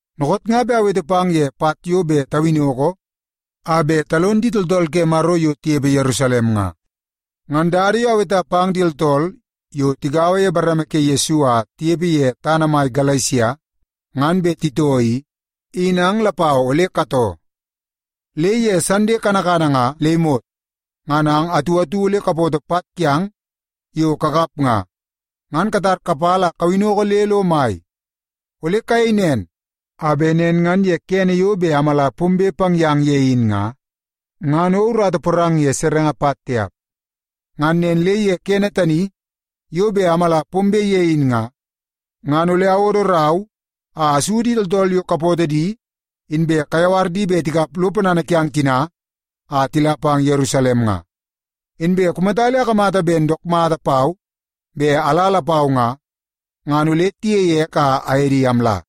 Nookoot nga be awete pang ye pat yo be tawinoko a be talon di tooltool ke Maro yo tiyepe Yerusalem nga. Ngan dada yo aweta pang di tooltool yo tigaua ye di bareme ke Yesu a tiyepe ye tana mai Galesia ngan be titoo i, in ang lapau ole katoo. Le ye Sande kanakana nga le imot, ngan ang atu atu ole kapoto pat kiang yo kakap nga, ngan katar kapala a kawinoko le lo mai. Ole kayei nen a be nen ngan ye kene yo be amala pombe pang yang ye in nga, ngan o urata porang ye serenge pat tiap. Ngan nen le ye kene tani yo be amala pombe ye in nga, ngan ole awodo rau a asu di tooltool yo kapootoo di inbe kayawar di be tikap lo ponana kiang tina a tila pang Yerusalem nga. Inbe kumata le akamata ben dook mata pau be ala lapau nga, ngan ole tiyei ek a aye di amla.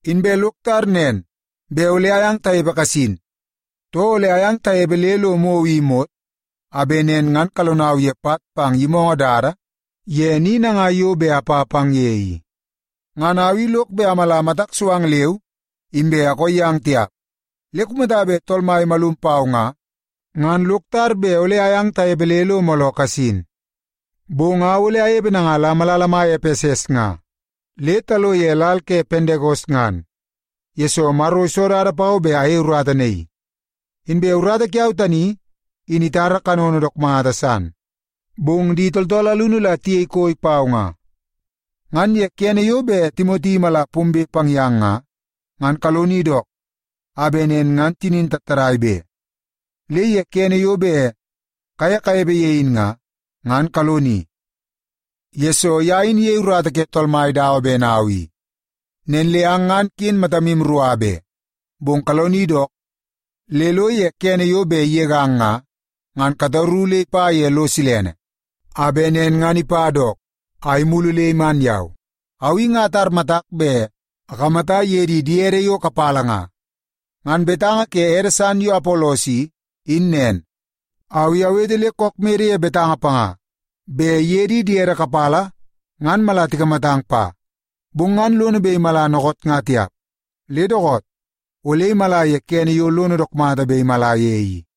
Inbe lok tar nen be ole ayang tayepe kasin, too ole ayang tayepe le lo mou i imot, a be nen ngan kalonau ye pat pang yimoongoo dada ye ni nangai yo be apa pang ye i. Ngan au i lok be amala matak so ang leu inbe akoo yang tiap. Le kumata be Tool Mai imalum pau nga, ngan lok tar be ole ayang tayepe le mooloo kasin. Bong au ole ayepe nanga la malala mai Epeses nga le talo ye lal ke Pendekos ngan, yesoo Maro iso dada pau be ayei urata naii. Inbe urata kiau tani in itara kanono dook mata san, bong di tooltool alunu la tiyei koi pau nga. Ngan ye kene yo be Timoti imala pombe pang yang nga, ngan kaloni dook a be nen ngan tinin tattadai be. Le ye kene yo be kaye kayepe ye in nga, ngan kaloni, yesoo ya in iyei urata ke Tool Mai dawa ben au i. Nen le ang ngan sa kin matan rua be. Bong kaloni dook le lo ye kene yo be iyegang nga, ngan kataru le ipa ye lo silene, a be nen ngan ipa dook a imulu le iman yau. Au i nga atar matak be akamata iye di diede yo kapala nga. Ngan betanga ke ede san yo Apolos i, in nen. Au i awete le kook mede ye betanga panga be iye di diede kapala ngan mala tikamatang pa, bong ngan lono be imala nookoot nga tiap. Le dookoot, ole imala ye kene yo lono dook mata be imala ye i.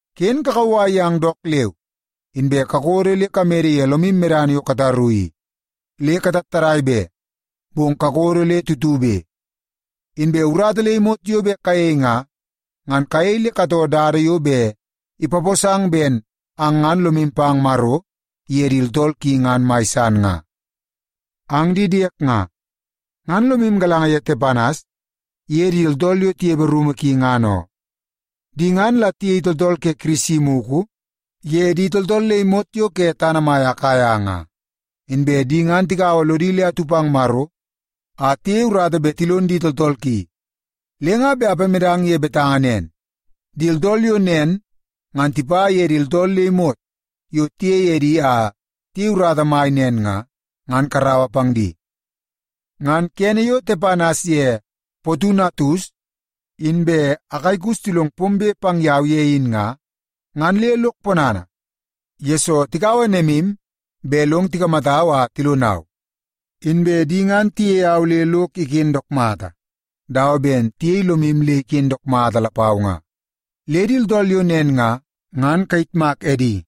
Kin kakawai yang dook leu, inbe kakodo le kamede ye lomim medana yo kataru i. Le katattadai be, bong kakodo le tutube. Inbe urata le imot yo be kayei nga, ngan kayei le katoo dada yo be ipaposang ben ang ngan lomim pang Maro iye di tooltool ki ngan mai san nga. Ang di diek nga, ngan lomim galanga ye Tepanas iye di tooltool yo tiyepe rumu ki, ngan oo. Di ngan la tiyei tooltool ke Kirisi muku ye di tooltool le imot yo ke tana mai Akaia nga. Inbe di ngan tigaua lodi le atu pang Maro a tiyei urata be tilon di tooltool ki. Le nga be apamedang ye betanga nen, di tooltool yo nen ngan tipa ye di tooltool le imot yo tiyei edi a tiyei urata mai nen nga, ngan karaua pang di. Ngan kene yo Tepanas ye Potunatus inbe Akaikus tilong pombe pang yau ye in nga, ngan le lok ponana, yesoo tikaua nemim be long tikamatau a tilonau. Inbe di ngan tiyei au le lok iken dook mata, dawa ben tiyei lomim le iken dook mata lapau nga. Le di tooltool yo nen nga, ngan kayitmak edi.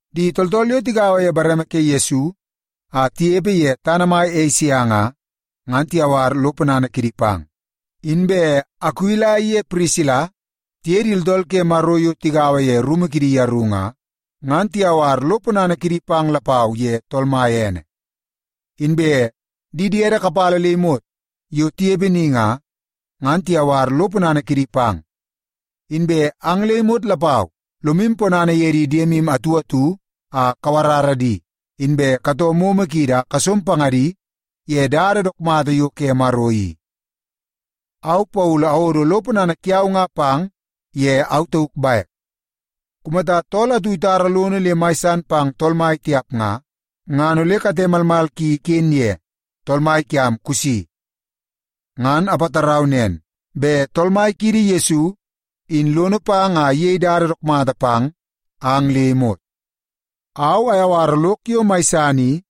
Di tooltool yo tigaua ye bareme ke Yesu a tiyepe ye tana mai Esia nga, ngan tiyawar lo ponana kidi pang. Inbe Akuila iye Pirisila tiye di tooltool ke Maro yo tigaua ye rumu kidi yaru nga, ngan tiyawar lo ponana kidi pang lapau ye Tool Mai ene. Inbe di diede kapala le imot yo tiyepe ni nga, ngan tiyawar lo ponana kidi pang. Inbe ang le imot lapau lomim ponana ye di diemim atu atu a kawarara di, inbe katoo momo kiidi a kasom pangadi ye dada dook mata yo ke Maro i. Au Paulu awodo lo ponana kiau nga pang ye au tauk baek. Kumata tool atu itara lono le mai san pang Tool Mai tiap nga, ngan ole kate malmal ki iken ye. Tool Mai kiam kusi! Ngan apatarau nen be Tool Mai kiidi Yesu, in lono pang a iyei dada dook mata pang ang le imot. Au ayawara lok yo mai san i,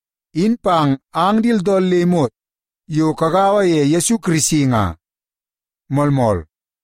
in pang ang di tooltool le imot yo kagaua ye Yesu Kirisi nga. Moolmool.